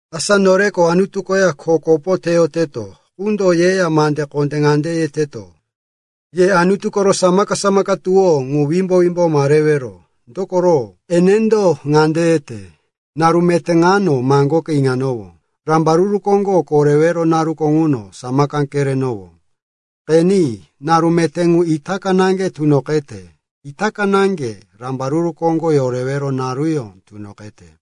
Asa noreko Anutu koya kho kopo teyoteto qundo yeya mande kondé ŋande yeteto, “Ye Anutu koro samaka-samaka tuwó ŋu wimbo-wimbo ma rewero.” Dokoro enendo ŋande yete, “Naru meté ŋuno maŋgoke iŋanowó, rambaruru koŋgo korewero naruko ŋuno samaka kerenowó.” Qeni, naru meté ŋu itaka naŋge tunoqete, itaka naŋge rambaruru koŋgo yorewero naruyó tunoqete.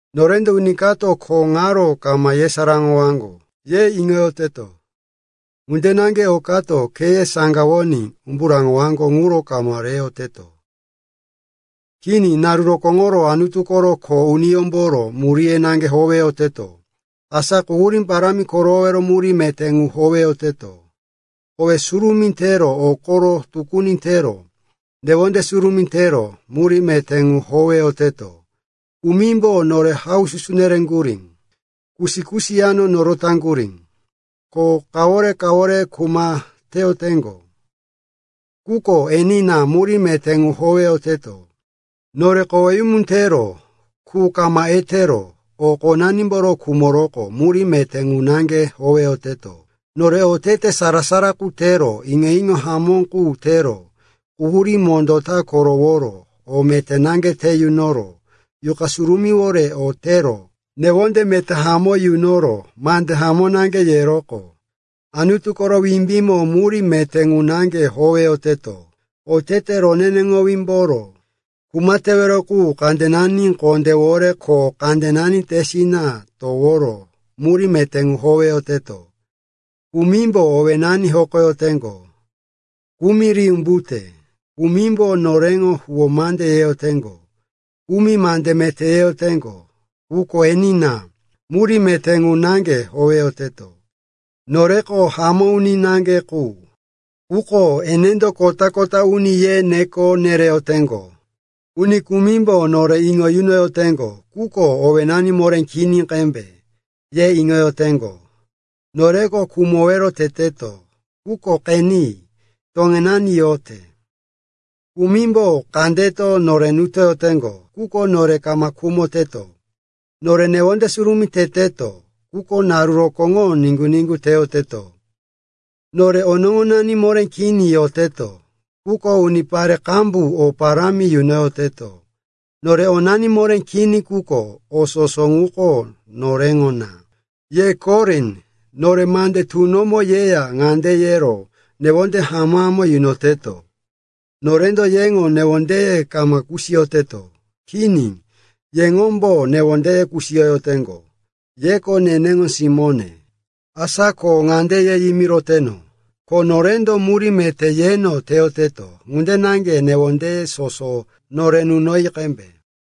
Norendo, uni kato kho ŋaro kama yesaráŋowaŋgo, ye iŋoyoteto. Ŋunde naŋge o kato kheye saŋgawoní umbu raŋowaŋgo ŋu kama reyoteto. Kini, naru rokóŋoro Anutu koro kho uniyómboro muríye naŋge howeyoteto. Asa quhurí parámi koroworo murí meté ŋu howeyoteto. Kowe surumí tero, o koro tukuni tero, newonde surumí tero murí meté ŋu howeyoteto. Kumimbo nore haususu nereŋgurí, kusi-kusi yano norotaŋgurí, ko kawore-kawore kuma teyoteŋgo. Quko enina, murí meté ŋu howeyoteto. Nore koweyumu tero, qu kama etero, o qonanimboro khumoroqo murí meté ŋu naŋge howeyoteto. Nore otete sara-sara qu tero, iŋo-iŋo hamó qu tero, quhurí mondó ta koroworo, o meté naŋge te yunoro, Yuqa Surumíwore o tero, newonde meté hamó yunoro, mande hamó naŋge yeroqo Anutu koro wimbímo murí meté ŋu naŋge howeyoteto. Otete roneneŋowímboro kuma tewero qu kandenani kondéwore ko kandenani tesina toworo murí meté ŋu howeyoteto. Kumimbo owénani hokoyoteŋgo, kumi ri umbute. Kumimbo noreŋo huwó mande yeyoteŋgo, kumi mande meté yeteŋgo. Quko enina, murí meté ŋu naŋge howeyoteto. Noreko hamó uni naŋge qu, quko enendo kota-kota uni ye neko nereyoteŋgo. Uni kumimbo nore iŋo yunoyoteŋgo, quko, owénani moré kini qembe, ye iŋoyoteŋgo. Noreko khumowero teteto, quko qeni, toŋenani yote. Kumimbo kandeto nore nutoyoteŋgo, quko nore kama khumoteto. Nore newonde surumí teteto, quko naru rokóŋo niŋgu-niŋgu teyoteto. Nore onoŋonani moré kini yoteto, quko unipare qambu o parámi yunoyoteto. Nore onani moré kini, quko o soso ŋuko noreŋo na. Ye Korin, nore mande tunomo yeya ŋande yero newonde hamó-hamó yunoteto. Norendo yeŋo newondeye kama kusiyoteto. Kini, yeŋombo newondeye kusiyoyoteŋgo. Yeko neneŋo simóne, asa ko ŋande ye yimiroteno, ko norendo murí meté yeno teyoteto ŋunde naŋge newondeye soso nore nunoyi qembe.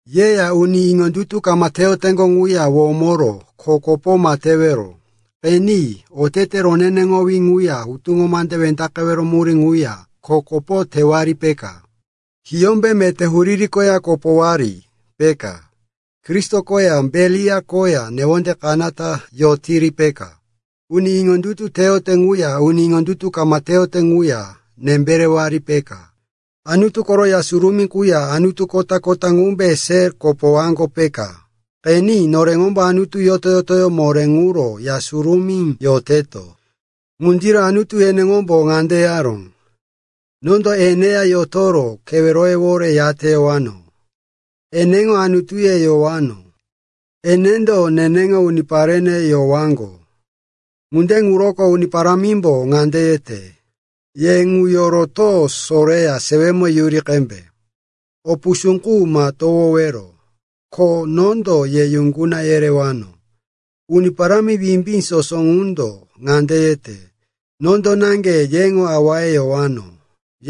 Yeya uni iŋondutu kama teyoteŋgo ŋuya womoro kho kopo ma tewero. Qeni, otete roneneŋowí ŋuya hutuŋo mande wendaqewero murí ŋuya kho kopo tewari, peka? Hiyómbe meté huriri koya kopowari, peka? Kristo koya Beliar koya newonde kanata yotiri, peka? Uni iŋondutu teyote ŋuya uni iŋondutu kama teyote ŋuya nembe rewari, peka? Anutu koro Ya Surumí quya anutu kota-kota ŋumbe se kopowaŋgo, peka? Qeni, noreŋombo Anutu yoto-yotoyó moré ŋuro Ya Surumí yoteto. Ŋundiro Anutu eneŋombo ŋande yaró, “Nondo eneya yotoro keweroyewore yateyowano. Eneŋo Anutuye yowano, enendo neneŋo uniparene yowaŋgo.” Ŋunde ŋuroko Uni Parámimbo ŋande yete, “Ye ŋu yoroto soreya sewemo yuri qembe. O pusú qu ma towowero, ko nondo ye yuŋguna yerewano.” Uni Parámi Wimbí Soso ŋundo ŋande yete, “Nondo naŋge yeŋo awaye yowano,